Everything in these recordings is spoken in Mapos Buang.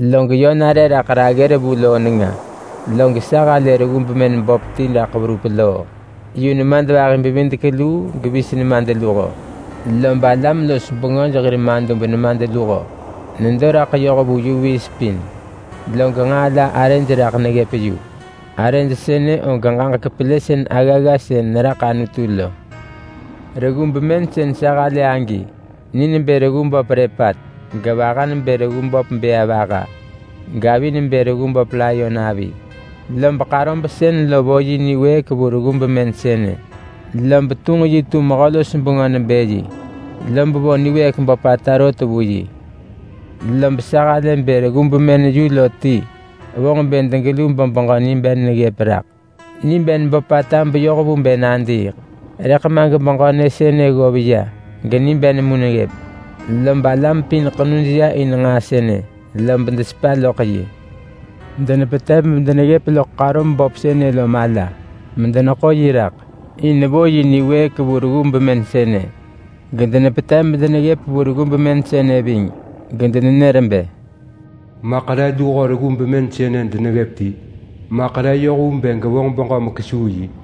Log yö nare raḳ raggër vu loo nenga. Lob sa halë reggu bemën böp ti raḳ verup loo. Yu nemadvahi-bevidek-luu gevis nemadluho. (Vis nebë burmakau). Lob alam-los-bengöj hir madub nemadluho nedo raḳ yoh vu vis pin. Log nġaa la arëj raḳ neggëp yu. Arëj sënë og ġaġek pelësën aggagga sën neraḳ Anutu lo. Reggu bemën sën sa halë agi ni nebë reggu böp lepat, gevaha nebë reggu böp bëa vaha, gavi nebë reggu böp layon avi. Lob ḳarob sën lo vo yi niwëëk vu reggu bemën sënë. Lob tunġ yi tu mehö-los-bengö nebë yi, lob vo niwëëk böpata rot vu yi. Lob sa halë bë reggu bemën yu lo ti vonġ bë degelu bebeġö niben neggëp raḳ. Niben böpata beyoh vu bë nadiiḳ, rëḳ ma gebeġö nyë sënë ggov ya geniben mu neggëp. Lob alam pin ḳenuj ya in nġaa sënë, lob desepa loḳ yi. Denepetev medeneggëp loḳ ḳarob böp sënë lo mala medeneḳo yi raḳ, in vo yi niwëëk vu reggu bemën sënë. Gedenepetev medeneggëp vu reggu bemën sënë ving, gedenenër bë, “Maḳ re luho reggu bemën sënë deneggëp ti? Maḳ re yoh vu bë gevonġ beġö mekesuu yi?”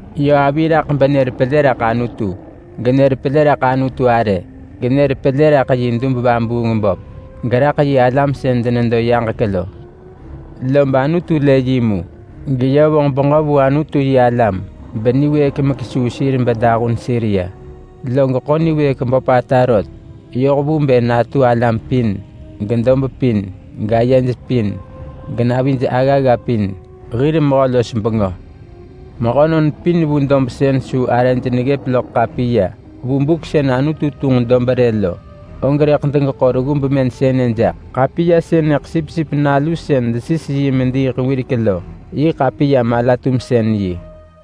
Yö avi raḳ benër pelë raḳ Anutu. Genër pelë raḳ Anutu arë, genër pelë raḳ yi dub-vabuung-böp, geraḳ yi alam sën denedo yaġek lo. Lob Anutu lë yi mu, geyö vonġ beġö vu Anutu-yi-alam beniwëëk mekesuu sir bedahun sir ya. Log ḳo niwëëk böpata rot yoh vu bë natu alam pin, gedob pin, gayej pin, genavij aggagga pin, hir mehö-los-bengö. Mehönon pin vu dob sën su arëj neggëp loḳ ḳapiya vu buk sën Anutu tunġ dob rë lo, og rëḳ degeḳo reggu bemën sënë jaḳ. Ḳapiya sënëḳ Sipsip Nalu sën desis yi mediiḳ wirek lo yi ḳapiya mala-tumsën-yi.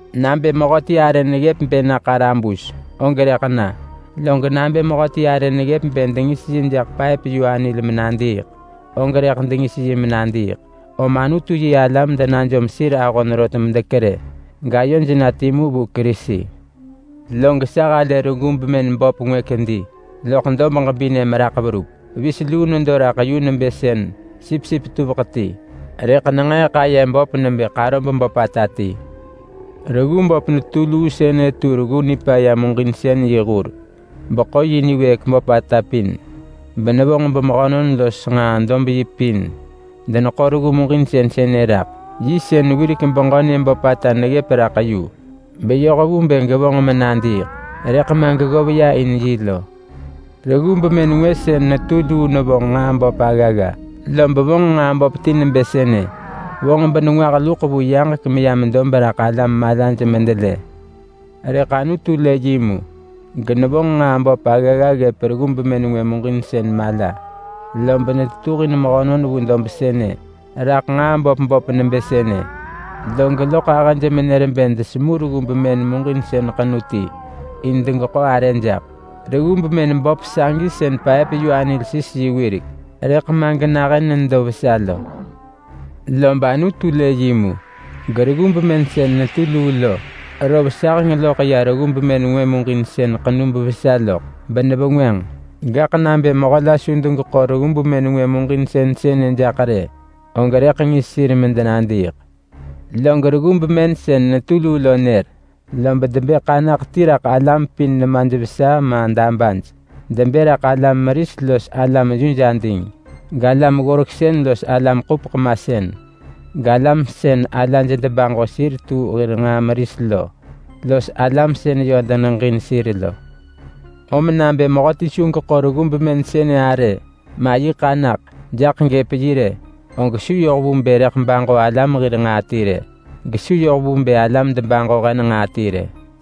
Nabë mehöti arë neggëp bë na ḳarabus, og rëḳ na. Log nabë mehöti arë neggëp bë dengis yi jaḳ paëp-yu-anil menadiiḳ, og rëḳ dengis yi menadiiḳ. Om Anutu-yi-alam denajom sir ahon rot medekerë, gayoj na timu vu Kerisi. Log sa halë reggu bemën böp ngwë kedi loḳ dob ġebinë meraḳ verup. Vis luu nedo raḳ yu nebë sën sipsip tuveḳ ti, rëḳ nenġeeḳ aye böp nebë ḳarob böpata ti. Reggu böp netu luu sënë tu reggu nipaya muġinsën yi hur beḳo yi niwëëk böpata pin, benevonġ bemehönon los nġaa-dob-yi pin deneḳo reggu muġinsën sënë raḳ. Yi sën wirek beġö nyë böpata neggëp raḳ yu beyoh vu bë gevonġ menadiiḳ, rëḳ ma geggov ya in yi lo. Reggu bemën ngwë sën netu luu nevonġ nġaa böp aggagga, lob vonġ nġaa böp ti nebë sënë: Vonġ benengwah luḳ vu yaġek meyam dob raḳ alam malaj medelë. Rëḳ Anutu lë yi mu, genevonġ nġaa böp aggagga ggëp reggu bemën ngwë muġinsën mala, lob netetuhin mehönon vu dob sënë raḳ nġaa böp böp nebë sënë. Log loḳ ahëj menër bë desemu reggu bemën muġinsën ḳenu ti in degeḳo arë jaḳ. Reggu bemën böp sagi sën paëp-yu-anil sis yi wirek, rëḳ ma genahën nedo vesa lo. Lob Anutu lë yi mu, gereggu bemën sën netu luu lo rov saheng loḳ ya reggu bemën ngwë muġinsën ḳenu bevesa loḳ, benevengwënġ. Gaḳ nabë mehö la su degeḳo reggu bemën ngwë muġinsën sënë jaḳ rë, og rëḳ ngis sir medenadiiḳ. Log reggu bemën sën netu luu lo nër, lob debë ḳanaḳ ti raḳ alam pin nemaj vesa ma dabaj. Debë raḳ alam-meris los alam-yuj-ading, galam-ggoreksën los alam-ḳupeḳ-masën, galam sën alaj debaġo sir tu hir nġaa meris lo los alam sën yö deneġin sir lo. Om nabë mehöti su geḳo reggu bemën sënë arë, ma yi ḳanaḳ, jaḳ gëp yi rë, og su yoh vu bë rëḳ baġo alam hir nġaa ti rë. Gesu yoh vu bë alam debaġo hen nġaa ti rë.